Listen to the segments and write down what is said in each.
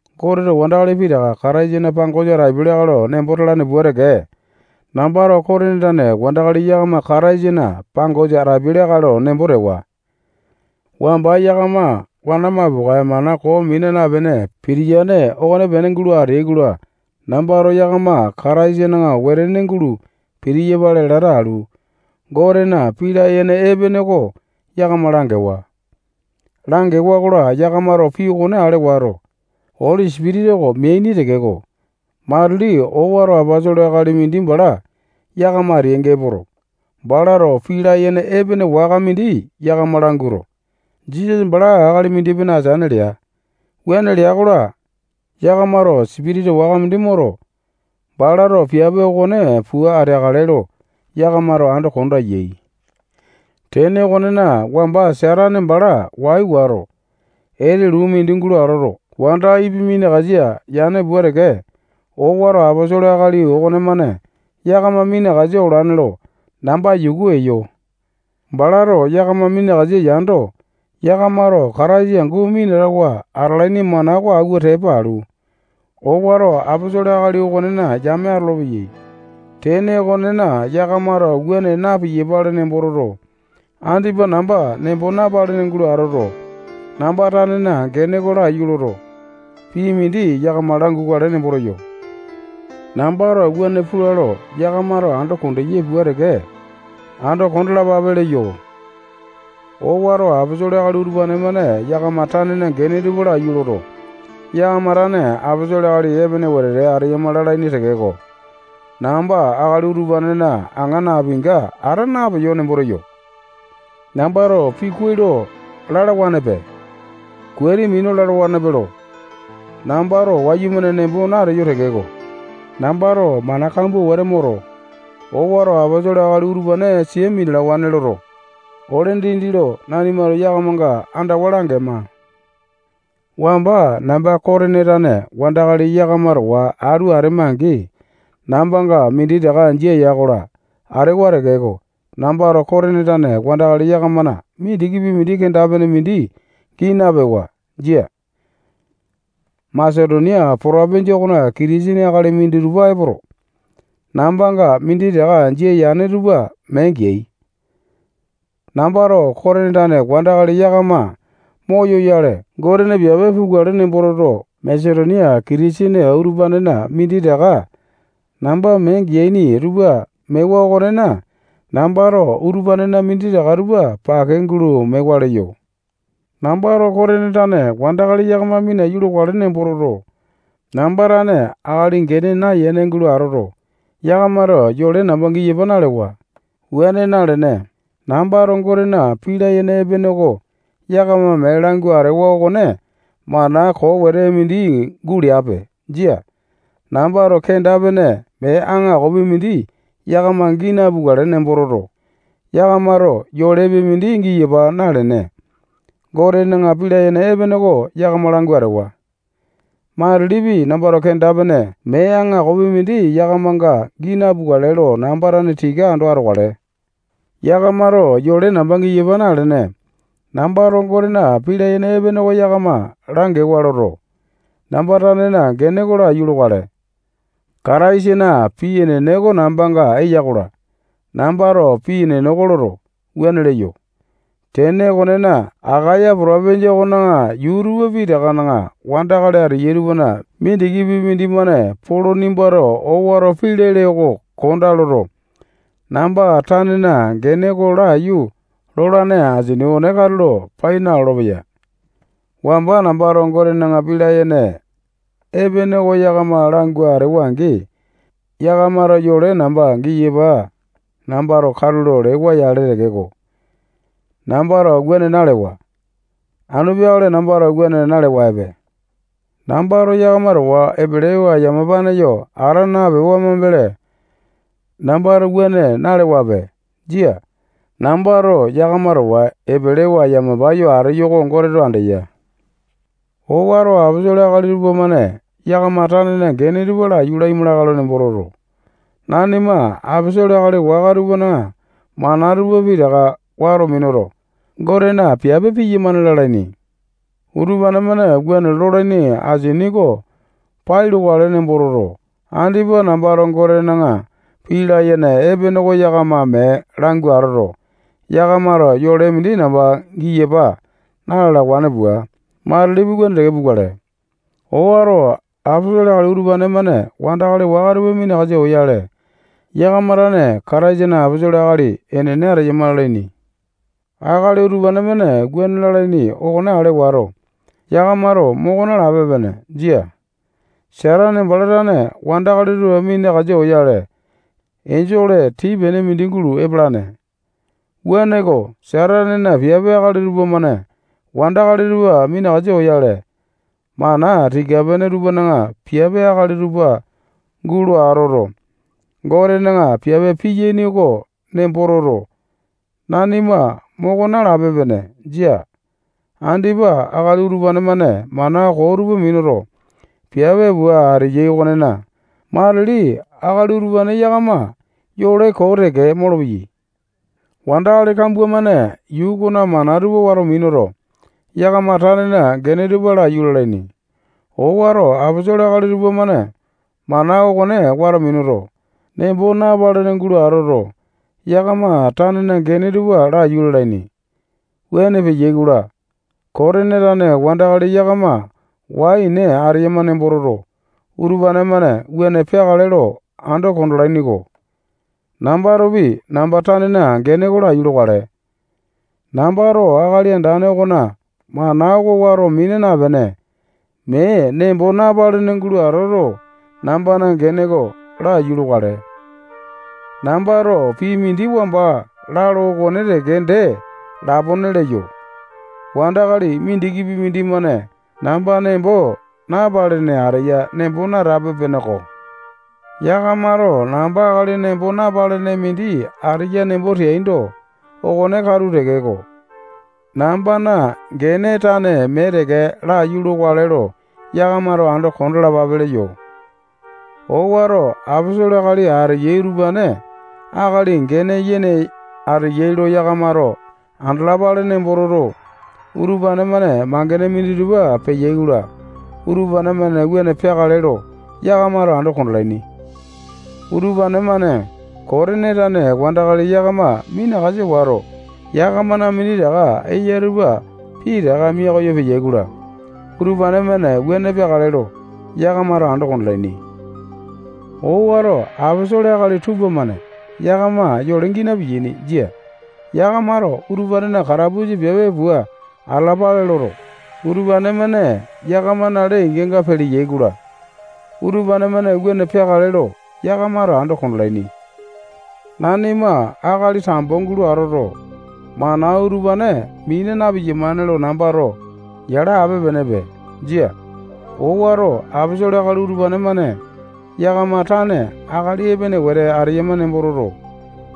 Goteto wandakali pitaka Kataisana pangosa atapiai lakae lo nembo talane pua teke, nambato Kotini tane wandakali yakama Kataisana pangosa atapiai lakae lo nembo tewa. Wamba yakama wana mapokae mana koo mina napene pitiyane okonepene gulo ateai-kola, nambato yakama Kataisana wetene gulo pitiyapale lata alu, Gotena pii layene epene oko yakama langewa. Langewa-kola, yakamato pii okone ale wato, Oli Sipitisa oko meaini tekeko, matili owato aposolo akali mindi bala yakama ateyainga epoto, balato pii layene epene waka mindi yakama languato, Jisasa bala akali mindi-pene ateane lea. Wuane lea-kola, yakamato sipitisa waka mindi moto, balato piape okone pua ateakale lo yakamato ando kondeai. Tene okonena, wamba Satane bala wai wato, etulu mindi gulo atoto, wanda Ipi minakasa yane pua teke, owato aposolo akali okonemane yakama minakasa olane lo namba yuku eyo. Balato yakama minakasa yando, yakamato Kataisa angu minatawa atalaini mana oko awua tepa alu, owato aposolo akali okonena yame atolopeyai. Tene okonena, yakamato wuane na-piyapale nembo toto, andipa namba nembo napalene gulo atoto, namba tanena gene oko laiyu loto, pii mindi yakama langukale nembo teyo. Nambato wuane pula lo yakamato ando kondeyai pua teke, ando kondalapape leyo. Owato aposolo akali utupane-mane yakama tanena gene tupa laiyu loto, yakama tane aposolo akali epene wetete ateyama lalaini tekeko, namba akali utupanena aŋa napinga ata napeyo nembo teyo. Nambato pii kuai lo lalawanepe, kuati minu lalawanepe lo, nambato wayumane nembo nateyo tekeko, nambato mana kambua wete moto, owato aposolo akali utupane sia minalawane loto, ole dindi lo nanimato yakamanga andawa langema. Wamba namba Kotini tane wandakali yakama towa atu atema-angi, nambanga minditaka jia ya-kola, atewa tekeko, nambato Kotini tane wandakali yakamana mindikipi mindi kenda-pene mindi gii napewa. Jia. Masetonia potopinjia okona Kitisene akali minditupa epoto, nambanga minditaka jia yane tupa mee geai. Nambato Kotini tane wandakali yakama moyoyale, Gotena piape pukale nembo toto, Masetonia Kitisene utupanena minditaka namba mee geaini tupa mewa okonena, nambato utupanena minditaka tupa pake gulo mewa leyo. Nambato Kotini tane wandakali yakama minaiyu lokale nembo toto, namba tane akali gene nayene gulo atoto, yakamato yole namba giyapa nalewa. Wuane nalene, nambato Gotena pii layene epene oko yakama mee langu atewa okone mana koo wete mindi guleape. Jia. Nambato kenda-pene mee aŋakopi mindi yakama gii napukale nembo toto, yakamato yolepi mindi giyapa nalene, Gotena pii layene epene oko yakama langu atewa. Matilipi, nambato kenda-pene mee aŋakopi mindi yakamanga gii napukale lo namba tane tika ando atokale. Yakamato yole namba giyapa nalene, nambato Gotena pii layene epene oko yakama langewa loto, namba tanena gene oko laiyu lokale. Kataisana pii enene oko nambanga eya-kola, nambato pii enene oko loto, wuane leyo. Tene okonena, Akaya potopinjia okona yuu tupa pitakana wandakali ateyai tupana mindikipi mindimane Polo nimbato owato pii lele oko kondaa loto, namba tanena gene oko laiyu lolane asini okone katulo pai nalolo-peya. Wamba nambato Gotena pii layene epene oko yakama langu atewa-angi, yakamato yole namba giyapa nambato katulo lewa-yale tekeko, nambato wuane nalewa. Anu peakale nambato wuane nalewape. Nambato yakama towa epelewa yamapane yo ata napewa mambele, nambato wuane nalewape. Jia. Nambato yakama towa epelewa yamapa yo ateyo oko Goteto andeya. Owato aposolo akali tupamane yakama tanena gene tupa laiyu laima lakae lo nembo toto, nanima aposolo akali waka tupana mana tupa pitaka wato minuto, Gotena piape piyamane lalaini. Utupane-mane wuane lolaini asini oko pai lokale nembo toto, andipa nambato Gotena pii layene epene oko yakama mee langu atoto, yakamato yole mindi namba giyapa na-lalawane pua, matilipi wuane teke pukale. Owato aposolo akali utupane-mane wandakali waka tupa minakasa oyale, yakama tane Kataisana aposolo akali enene ateyama lalaini. Akali utupane-mane wuane lalaini okone ale wato, yakamato moko nalape-pene. Jia. Satane bala tane wandakali tupa minakasa oyale, enjole tii-pene mindi gulo epalane. Wuaneko, Satanena piape akali tupamane wandakali tupa minakasa oyale, mana tika-pene tupana piape akali tupa gulo atoto, Gotena piape piyaini oko nembo toto, nanima moko nalape-pene. Jia. Andipa akali utupane-mane mana koo tupa minuto, piape pua ateyai okonena, matili akali utupane yakama yole koo teke molopeyai. Wandakali kambua-mane yuu okona mana tupa wato minuto, yakama tanena gene tupa laiyu lalaini. Owato aposolo akali tupamane mana okone wato minuto, nembo napalene gulo atoto, yakama tanene gene tupa laiyu lalaini. Wuane peyai-kola, Kotini tane wandakali yakama wai-ene ateyama nembo toto, utupane-mane wuane peakale lo ando kondalaini-ko. Nambatopi namba tanena gene oko laiyu lokale. Nambato Akali Andane okona mana oko wato mina napene, mee nembo napalene gulo atoto, nambana gene oko laiyu lokale. Nambato pii mindi wamba lalo okone teke dee lapone leyo. Wandakali mindikipi mindimane namba nembo napalene ateya nembo natape-peneko. Yakamato namba akali nembo napalene mindi ateya nembo teaindo, okone katu tekeko, nambana gene tane mee teke laiyu lokale lo yakamato ando kondalapape leyo. Owato aposolo akali ateyai utupane akali gene yene ateyai lo yakamato andalapale nembo toto, utupane-mane mangene minditupa peyai-kola, utupane-mane wuane peakale lo, yakamato ando kondalaini. Utupane-mane Kotini tane wandakali yakama minakasa wato, yakamana minditaka eya tupa pitaka mia koyo peyai-kola, utupane-mane wuane peakale lo, yakamato ando kondalaini. Owato aposolo akali tupamane yakama yole gii napiyaini. Jia. Yakamato utupanena katapusa piape pua atalapale loto, utupane-mane yakamana lee-inganga peleyai-kola, utupane-mane wuane peakale lo, yakamato ando kondalaini. Nanima akali tambo gulo atoto, mana utupane mina na-piyamane lo nambato yala ape-penepe. Jia. Owato aposolo akali utupane-mane yakama tane akali epene wete ateyama nembo toto,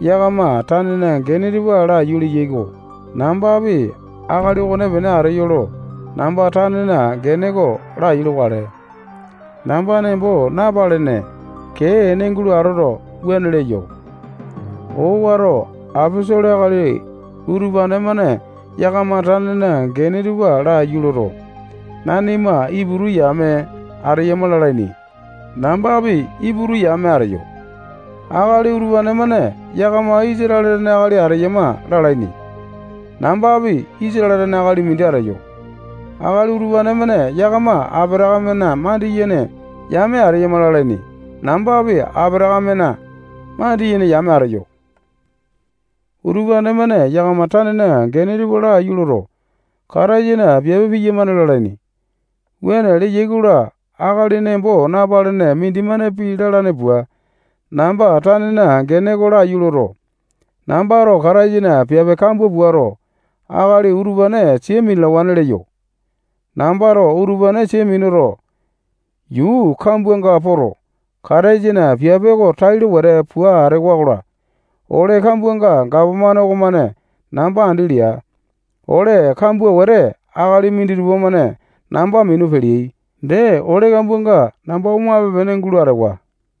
yakama tanena gene tupa laiyu leyai-ko. Nambapi akali okonepene ateyo lo namba tanena gene oko laiyu lokale. Namba nembo napalene, kee ene gulo atoto, wuane leyo. Owato aposolo akali utupane-mane yakama tanena gene tupa laiyu loto, nanima Iputu yame ateyama lalaini. Nambapi Iputu yame ateyo. Akali utupane-mane yakama Isatale tane akali ateyama lalaini. Nambapi Isatale tane akali mindi ateyo. Akali utupane-mane yakama Apatakamena mandiyene yame ateyama lalaini. Nambapi Apatakamena mandiyene yame ateyo. Utupane-mane yakama tanena gene tupa laiyu loto, Kataisana piape piyamane lalaini. Wuane leyai-kola, akali nembo napalene mindimane pii lalane pua, namba tanena gene oko laiyu loto, nambato Kataisana piape kambua puato, akali utupane sia minalawane leyo. Nambato utupane sia minuto, yuu kambuanga poto, Kataisana piape oko tailo wete pua atewa-kola, ole kambuanga gapomane okomane namba andi lea. Ole kambua wete akali minditupa-mane namba minu peleai. Dee, ole kambuanga namba omape-pene gulo atewa.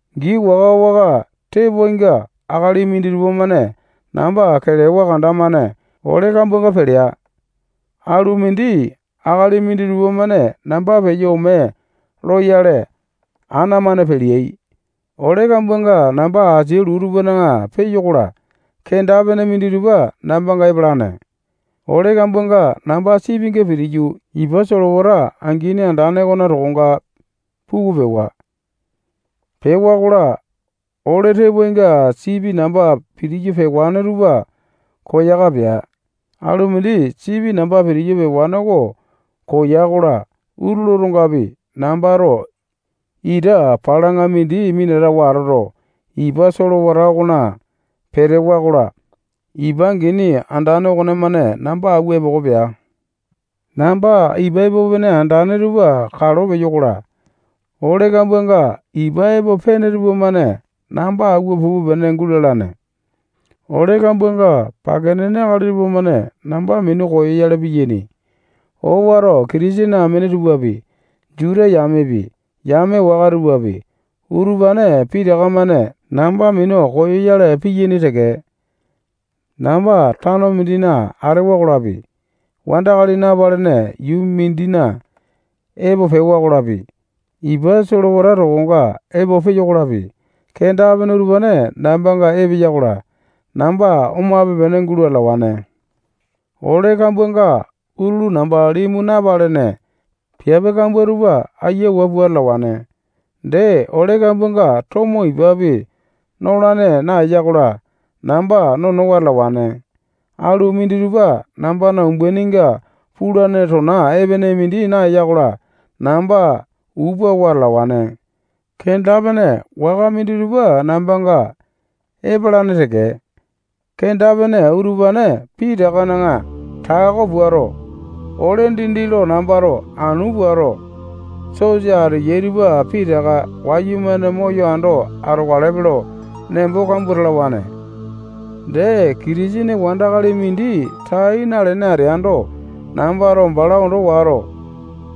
Gii waka-waka tepoainga akali minditupa-mane namba kelewa kanda-mane ole kambuanga pelea. Alu mindi akali minditupa-mane namba peyo ome loyale, ana-mane peleai. Ole kambuanga namba asia luu tupana peyo-kola, kenda-pene minditupa nambanga epalane. Ole kambuanga namba sipinga pitiyu, ipa solewata angini andane okona tokonga puku pewa. Pewa-kola, ole tepoainga sipi namba pitiyu pewane tupa koyaka pea. Alu mindi sipi namba pitiyu pewane oko koya-kola, utulu otongapi, nambato ita palaŋa mindi minatawa atoto, ipa solewata okona petewa-kola, ipa angini andane okonemane namba awua epoko pea. Namba ipa epo pene andane tupa kalo peyo-kola, ole kambuanga ipa epo pene tupamane namba awua pupe-pene gulalane. Ole kambuanga pake nene akali tupamane namba minu koyoyale piyaini. Owato Kitisene amene tupapi, Juta yamepi, yame waka tupapi, utupane pitaka-mane namba minu koyo-yale piyaini teke. Namba tano mindina atewa-kolapi, wandakali napalene yuu mindina epo peyo-kolapi, ipa solewata tokonga epo peyo-kolapi, kenda-pene utupane nambanga epeya-kola, namba omape-pene gulo atalawane. Ole kambuanga utulu namba limu napalene, piape kambua tupa ayiawa pua atalawane. Dee, ole kambuanga tomo, ipapi nolane naeya-kola, namba nonowa atalawane. Alu minditupa nambana umbaininga pulane tona epene mindi naeya-kola, namba upa wa atalawane. Kenda-pene waka minditupa nambanga epalane teke. Kenda-pene utupane pitakana tako puato, ole dindi lo nambato anu puato, sosa ateyai tupa pitaka wayumane moyo ando atokalepe lo nembo kambua talawane. Dee, Kitisene wandakali mindi tai nalene ateando, nambato bala ondo wato,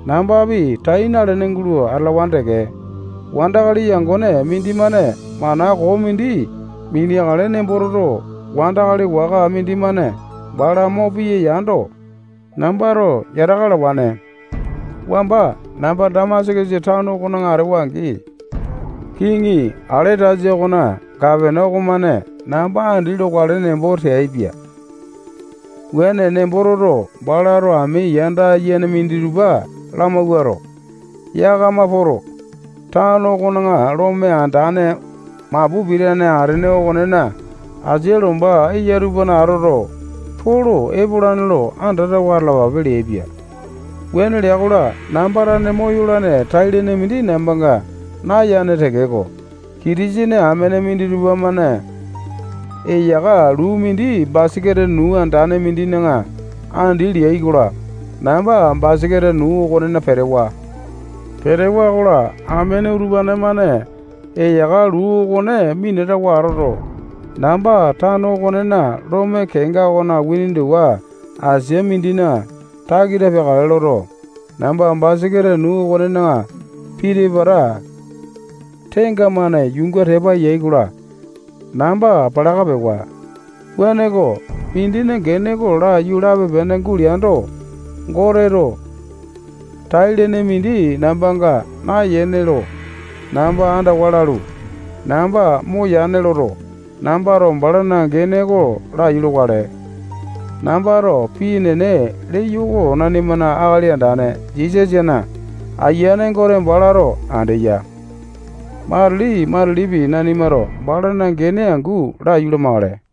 nambapi tai nalene gulo atalawane teke. Wandakali yangone mindimane mana koo mindi mineakale nembo toto, wandakali waka mindimane bala mo piya yando, nambato yataka alawane. Wamba namba Damasakasa tano okona atewa-angi, kiŋi Aletasa okona gapana okomane namba andi lokale nembo teaipia. Wuane nembo toto, balato ami yanda yene minditupa lamawuato, yakama poto, tano okona lome andane mapu pitane atene okonena asia lomba eya tupana atoto, Polo epolane lo andatawa atalapa leaipia. Wuane lea-kola, namba tane moyolane tai-lene mindi nambanga nayane tekeko, Kitisene amene minditupa-mane eyaka luu mindi basaketa nuu andane mindina andi leai-kola, namba basaketa nuu okonena petewa. Petewa-kola, amene utupane-mane eyaka luu okone minatawa atoto, namba tano okonena lome kenga okona windowa asia mindina takita peakale loto, namba basaketa nuu okonena piti-pata tenga-mane yuunga tepa yai-kola, namba palaka pewa. Wuaneko, mindina gene oko laiyu lape-pene guleando, Goteto tai-lene mindi nambanga nayane lo namba andawa lalu, namba moyane loto, nambato balana gene oko laiyu lokale. Nambato pii enene leyo oko nanimana Akali Andane Jisasana Ayiane Gote balato andeya. Matili-matilipi nanimato balana gene angu laiyu lamakale.